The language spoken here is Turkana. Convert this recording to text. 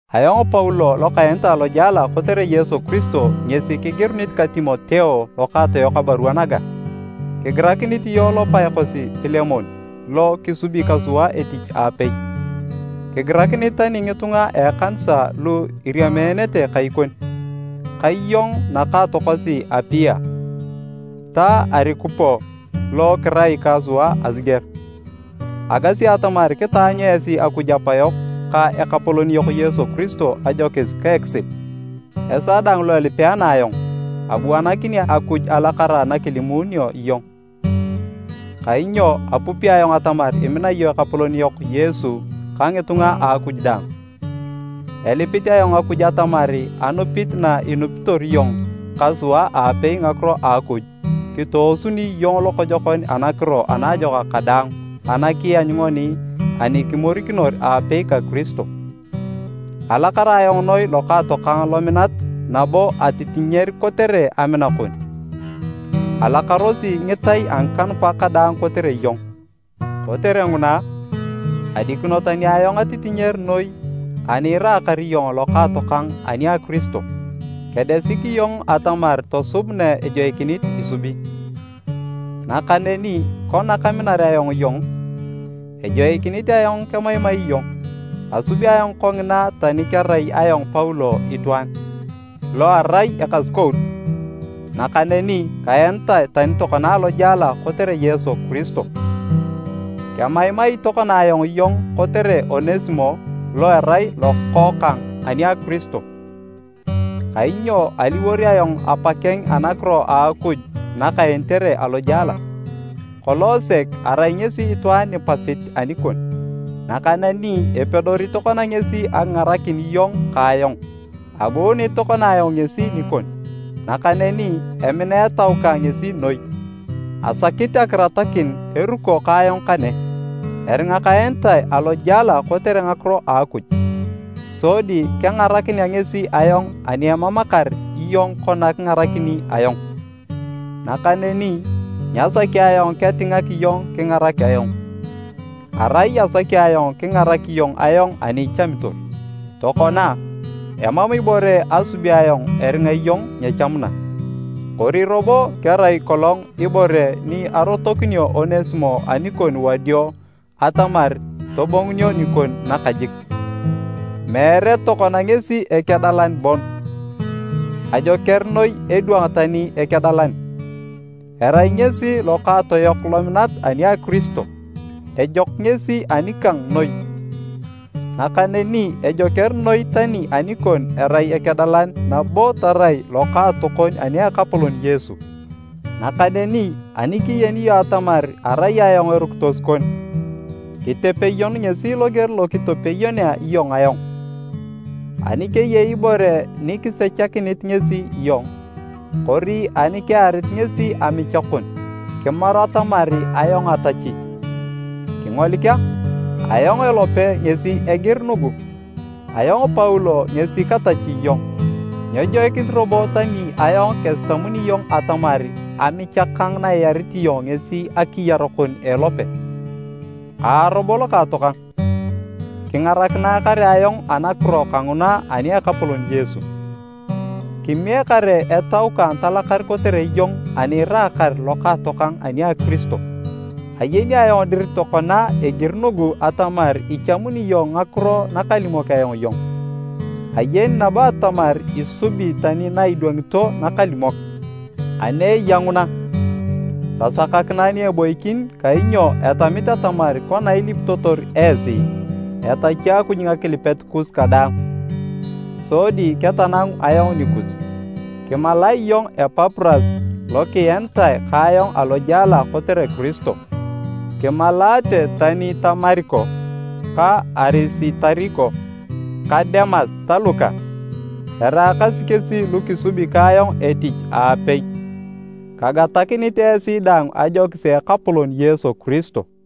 Ayong Paulo lokaenitae alojela kotere Yesu Kiristo ngesi kigirunit ka Timoteo lokaatoyok abarua naga. Kigirakinit iyong lopae kosi Pilemon lo kisubi ka sua etich aapei, kigirakinit tani ngitunga a ekanisa lu iriameenete kai kon, ka iyong nakaatokosi Apia, ta Arikupo lo kirai ka sua asiger. Agasi atamar kitaanyu esi Akuj Apa yok ka Ekapolon yok Yesu Kiristo ajokis ka ekisil. Esaa daang lo elipeenea ayong, abuanakini Akuj alakara nakalimuununio iyong. Kainyo apupi ayong atamar imina iyong Ekapolon yok Yesu ka ngitunga a Akuj daang. Elipit ayong Akuj atamar anupit na inupitor iyong ka sua aapei ngakiro a Akuj, kitoosuni iyong lokojokon anakiro anaajokak kadaang ana kianyu ngoni ani kimorikinor aapei ka Kiristo. Alakar ayong noi lokaatokang lominat nabo atitinyer kotere amina kon! Alakarosi ngitai a ngikanupak kadaang kotere iyong. Kotere nguna, adikino tani ayong atitinyer noi ani iraakar iyong lokaatokang ani a Kiristo, kedesik iyong atamar tosub na ejoikinit isubi. Nakaneni kona kaminar ayong iyong, ejoikinit ayong kemaimai iyong. Asubi ayong kongina tani kerai ayong Paulo itwaan, lo arai ekasukout, nakaneni kaenitae tani tokona alojela kotere Yesu Kiristo. Kemaimai tokona ayong iyong kotere Onesimo lo erai lokookang ani a Kiristo, kainyo aliwor ayong apa keng anakiro a Akuj nakaenitere alojela. Kolong sek arai ngesi itwaan nipasit anikon, nakaneni epedori tokona ngesi akingarakin iyong ka ayong. Abuunit tokona ayong ngesi nikon, nakaneni emina etau kang ngesi noi. Asakit akiratakin eruko ka ayong kane, eringa kaenitae alojela kotere ngakiro a Akuj, sodi kengarakinea ngesi ayong ani emamakar iyong kona kingarakini ayong. Nakaneni, nyasaki ayong ketingak iyong kingarak ayong, arai asaki ayong kingarak iyong ayong ani ichamitor. Tokona, emam ibore asubi ayong eringa iyong nyechamuna. Kori robo kerai kolong ibore ni arotokinio Onesimo anikon wadio atamar tobongunio nikon nakajik. Meere tokona ngesi ekedalan bon, ajoker noi edwang tani ekedalan, erai ngesi lokaatoyok lominat ani a Kiristo! Ejok ngesi anikang noi, nakaneni ejoker noi tani anikon erai ekedalan nabo tarai lokaatokon ani Ekapolon Yesu! Nakaneni ani kiyeni iyong atamar arai ayong erukitos kon, kitepeyon ngesi loger lo kitepeyonea iyong ayong. Ani keyei ibore nikisechakinit ngesi iyong, kori ani kearit ngesi amicha kon, kimaru atamar ayong atachi. Kingolik a, ayong elope ngesi egir nugu, “Ayong Paulo ngesi katachi iyong.” (Nyejoikinit robo tani ayong kesitamuni iyong atamar amicha kang na iarit iyong ngesi akiyar kon a elope). Aa robo lokaatokang, kingarakinae kare ayong anakiro kanguna ani a Ekapolon Yesu, kimiek kare etau kang talakar kotere iyong ani iraakar lokaatokang ani a Kiristo. Ayeni ayong dir tokona egiri nugu atamar ichamuni iyong ngakiro nakalimok ayong iyong, ayeni nabo atamar isubi tani na idwangito nakalimok. Ani eya nguna, tasakakinae ni eboikin kainyo etamit atamar kona ilipitotor esi, etachi Akuj ngakilipet kus kadaang, sodi ketanangu ayong nikus. Kimalae iyong Epapuras lokienitae ka ayong alojela kotere Kiristo, kimalaate tani ta Mariko, ka Arisitariko, ka Demas ta Luka, eraakasi kesi lu kisubi ka ayong etich aapei. Kagatakinit esi daang ajokis a Ekapolon Yesu Kiristo.